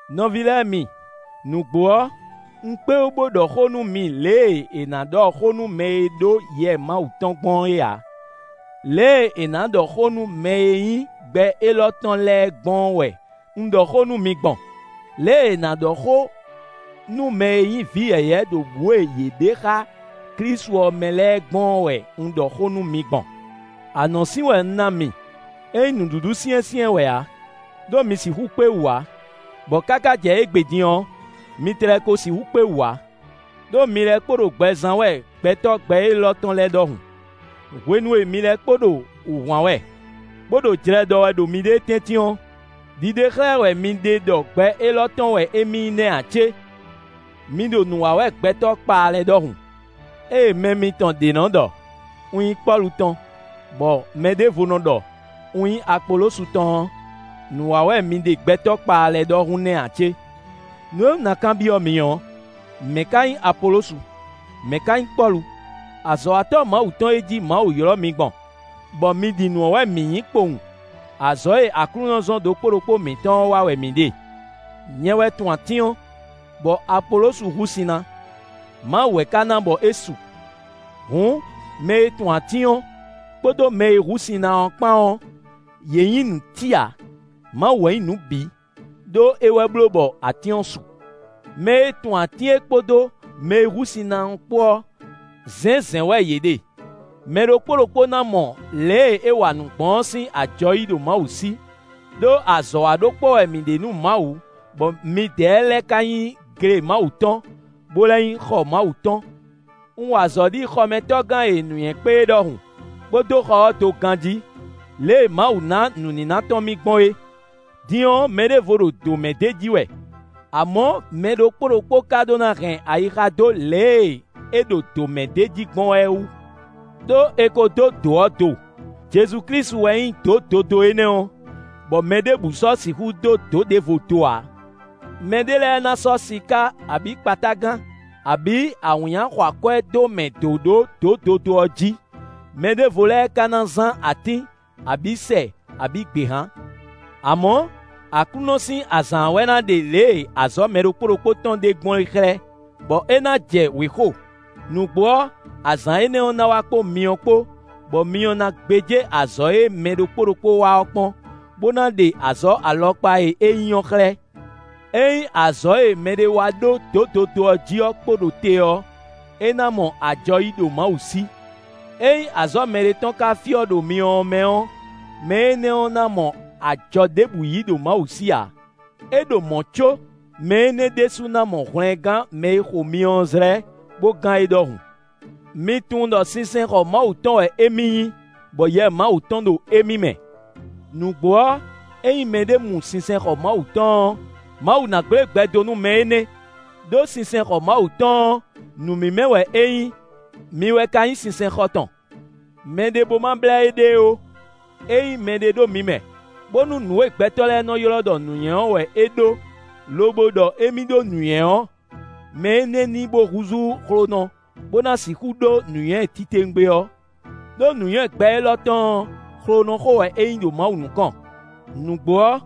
Nɔví lɛ́ɛ mi, nǔgbó ɔ́, un kpé wú bó ɖɔ xó nú mi lě e è nǎ ɖɔ xó nú mɛ e ɖó Yɛ Mawu tɔn gbɔn é ǎ: lě e è nǎ ɖɔ xó nú mɛ e nyí gbɛ élɔ́ tɔn lɛ́ɛ gbɔn ɔ́ wɛ un ɖɔ xó nú mi gbɔn. Lě e è nǎ ɖɔ xó nú mɛ e nyí vǐ yɛ̌yɛ́ ɖo bǔ e yě ɖe xá Klísu ɔ́ mɛ lɛ́ɛ gbɔn ɔ́ wɛ un ɖɔ xó nú mi gbɔn. Anɔ̌sin wɛ un ná mi; é nyí nǔɖuɖu syɛ́nsyɛ́n wɛ ǎ, ɖó mi sixú kpé wú ǎ; bɔ káká jɛ égbé din ɔ́, mi tlɛ ko sixú kpé wú ǎ. Đó mi lɛ́ kpo ɖo gbɛ zán wɛ gbɛtɔ́ gbɛ élɔ́ tɔn lɛ́ɛ ɖɔhun. Hwenu e mi lɛ́ kpo ɖo wǔhwan wɛ, bó ɖo jlɛ ɖɔ wɛ ɖo miɖée tɛ́ntin ɔ́, ɖiɖe xlɛ́ wɛ mi ɖe ɖɔ gbɛ élɔ́ tɔn wɛ émí nyí nɛ́ ǎ cé? Mi ɖo nǔ wa wɛ gbɛtɔ́ kpaa lɛ́ɛ ɖɔhun. Ée mɛ mitɔn ɖě nɔ ɖɔ: “Un nyí Pɔ́lu tɔn”, bɔ mɛɖěvo nɔ ɖɔ: “Un nyí Apolosu tɔn” ɔ́, nǔ wa wɛ mi ɖe gbɛtɔ́ kpaa lɛ́ɛ ɖɔhun nɛ́ ǎ cé? Nǔ e un ná kanbyɔ́ mi ɔ́, mɛ̌ ka nyí Apolosu? Mɛ̌ ka nyí Pɔ́lu? Azɔ̌watɔ́ Mawu tɔn e jí Mawu ylɔ́ mi gbɔn, bɔ mi ɖi nǔ ɔ́ wɛ mǐ nyí kpowun. Azɔ̌ e Aklúnɔ zɔ́n ɖokpó ɖokpó mǐtɔn ɔ́ wa wɛ mǐ ɖe. Nyɛ wɛ tun atín ɔ́, bɔ Apolosu hú sin ná; Mawu wɛ ka ná bɔ é su. Hǔn, mɛ e tun atín ɔ́, kpódó mɛ e hú sin ná ɔ́ kpán ɔ́, yě nyí nǔtí ǎ. Mawu wɛ nyí nǔ bǐ; ɖó é wɛ bló bɔ atín ɔ́ su. Mɛ e tun atín é kpódó mɛ e hú sin ná é kpó ɔ́, zɛ̌nzɛ̌n wɛ yě ɖe; mɛ ɖokpó ɖokpó ná mɔ lě e é wa nǔ gbɔn ɔ́ sín ajɔ yí ɖo Mawu sí. Đó azɔ̌ wa ɖó kpɔ́ wɛ mǐ ɖe nú Mawu, bɔ midɛɛ lɛ́ɛ ka nyí gle Mawu tɔn, bó lɛ́ nyí xɔ Mawu tɔn. Un wa azɔ̌ ɖi xɔmɛtɔ́gán e nǔnywɛ́ kpé é ɖɔhun, bó dó xɔ ɔ́ do ganjí, lě e Mawu ná nǔníná tɔn mì gbɔn é. Din ɔ́, mɛɖěvo ɖo dǒ mɛ ɖ'é jí wɛ. Amɔ̌, mɛ ɖokpó ɖokpó ka ɖó ná hɛn ayixa dó lě e é ɖo dǒ mɛ ɖ'é jí gbɔn wɛ é wú. Đó è ko dó dǒ ɔ́ do; Jezu Klísu wɛ nyí dǒ dodó énɛ́ ɔ́, bɔ mɛ ɖěbǔ sɔ́ sixú dó dǒ ɖěvo do ǎ. Mɛ ɖé lɛ́ɛ ná sɔ́ siká abǐ kpatágan, abǐ awǐnnya xɔ akwɛ́ dó mɛ dǒ ɖó dǒ dodó ɔ́ jí; mɛɖěvo lɛ́ɛ ka ná zán atín, abǐ sɛ, abǐ gběhan. Amɔ̌, Aklúnɔ sín azǎn ɔ́ wɛ ná ɖe lě e azɔ̌ mɛ ɖokpó ɖokpó tɔn ɖe gbɔn é xlɛ́, bɔ é ná jɛ wěxo. Nǔgbó ɔ́, azǎn énɛ́ ɔ́ ná wá kpó myɔ kpó, bɔ myɔ ná gbéjé azɔ̌ e mɛ ɖokpó ɖokpó wa ɔ́ kpɔ́n, bó ná ɖe azɔ̌ alɔkpa e é nyí ɔ́ xlɛ́. Ényí azɔ̌ e mɛɖé wa ɖó dǒ dodó ɔ́ jí ɔ́ kpo ɖo te ɔ́, é ná mɔ ajɔ yí ɖo Mawu sí. Ényí azɔ̌ mɛɖé tɔn ka fyɔ́ ɖo myɔ ɔ́ mɛ ɔ́, mɛ énɛ́ ná mɔ ajɔ ɖěbǔ yí ɖo Mawu sí ǎ; é ɖo mɔ̌ có mɛ énɛ́ ɖésú ná mɔ hwlɛngán mɛ e xo myɔ ɔ́ zlɛ́, bó gán é ɖɔhun. Mi tunwun ɖɔ sinsɛnxɔ Mawu tɔn wɛ émí nyí, bɔ Yɛ Mawu tɔn ɖo émí mɛ. Nǔgbó ɔ́, ényí mɛɖé mu sinsɛnxɔ Mawu tɔn ɔ́, Mawu ná gblé gbɛ dó nú mɛ énɛ́; ɖó sinsɛnxɔ Mawu tɔn ɔ́, nǔ mímɛ́ wɛ é nyí; mi wɛ ka nyí sinsɛnxɔ tɔn. Mɛɖé bó ma blɛ́ éɖée ó. Ényí mɛɖé ɖo mi mɛ, bónú nǔ e gbɛtɔ́ lɛ́ɛ nɔ ylɔ́ ɖɔ nǔnywɛ́ ɔ́ wɛ é ɖó, lobo ɖɔ émí ɖó nǔnywɛ́ ɔ́, mɛ énɛ́ ní bó húzú xlonɔ bó ná sixú ɖó nǔnywɛ́ titewungbe ɔ́. Đó nǔnywɛ́ gbɛ élɔ́ tɔn ɔ́, xlonɔxó wɛ é nyí ɖo Mawu nukɔn. Nǔgbó ɔ́,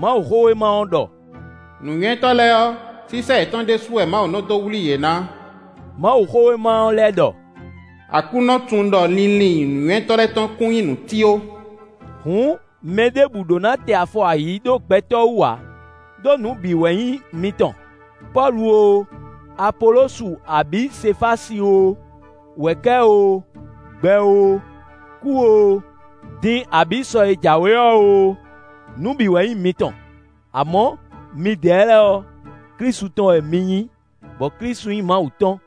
Mawuxówéma ɔ́ ɖɔ: “Nǔnywɛ́tɔ́ lɛ́ɛ ɔ́, sísɛ́ yětɔn ɖésú wɛ Mawu nɔ dó wlí yě ná.” Mawuxówéma ɔ́ lɛ́ ɖɔ: “Aklúnɔ tunwun ɖɔ linlin nǔnywɛ́tɔ́ lɛ́ɛ tɔn kún nyí nǔtí ó.” Hǔn mɛ ɖěbǔ ɖó ná tɛ afɔ ayǐ ɖó gbɛtɔ́ wú ǎ; ɖó nǔ bǐ wɛ nyí mitɔn: Pɔ́lu oo, Apolosu abǐ Sefási oo, wɛ̌kɛ́ oo, gbɛ oo, kú oo, din abǐ sɔ e jǎwe ɔ́ oo, nǔ bǐ wɛ nyí mitɔn. Amɔ̌ midɛɛ lɛ́ɛ ɔ́, Klísu tɔn wɛ mi nyí, bɔ Klísu nyí Mawu tɔn.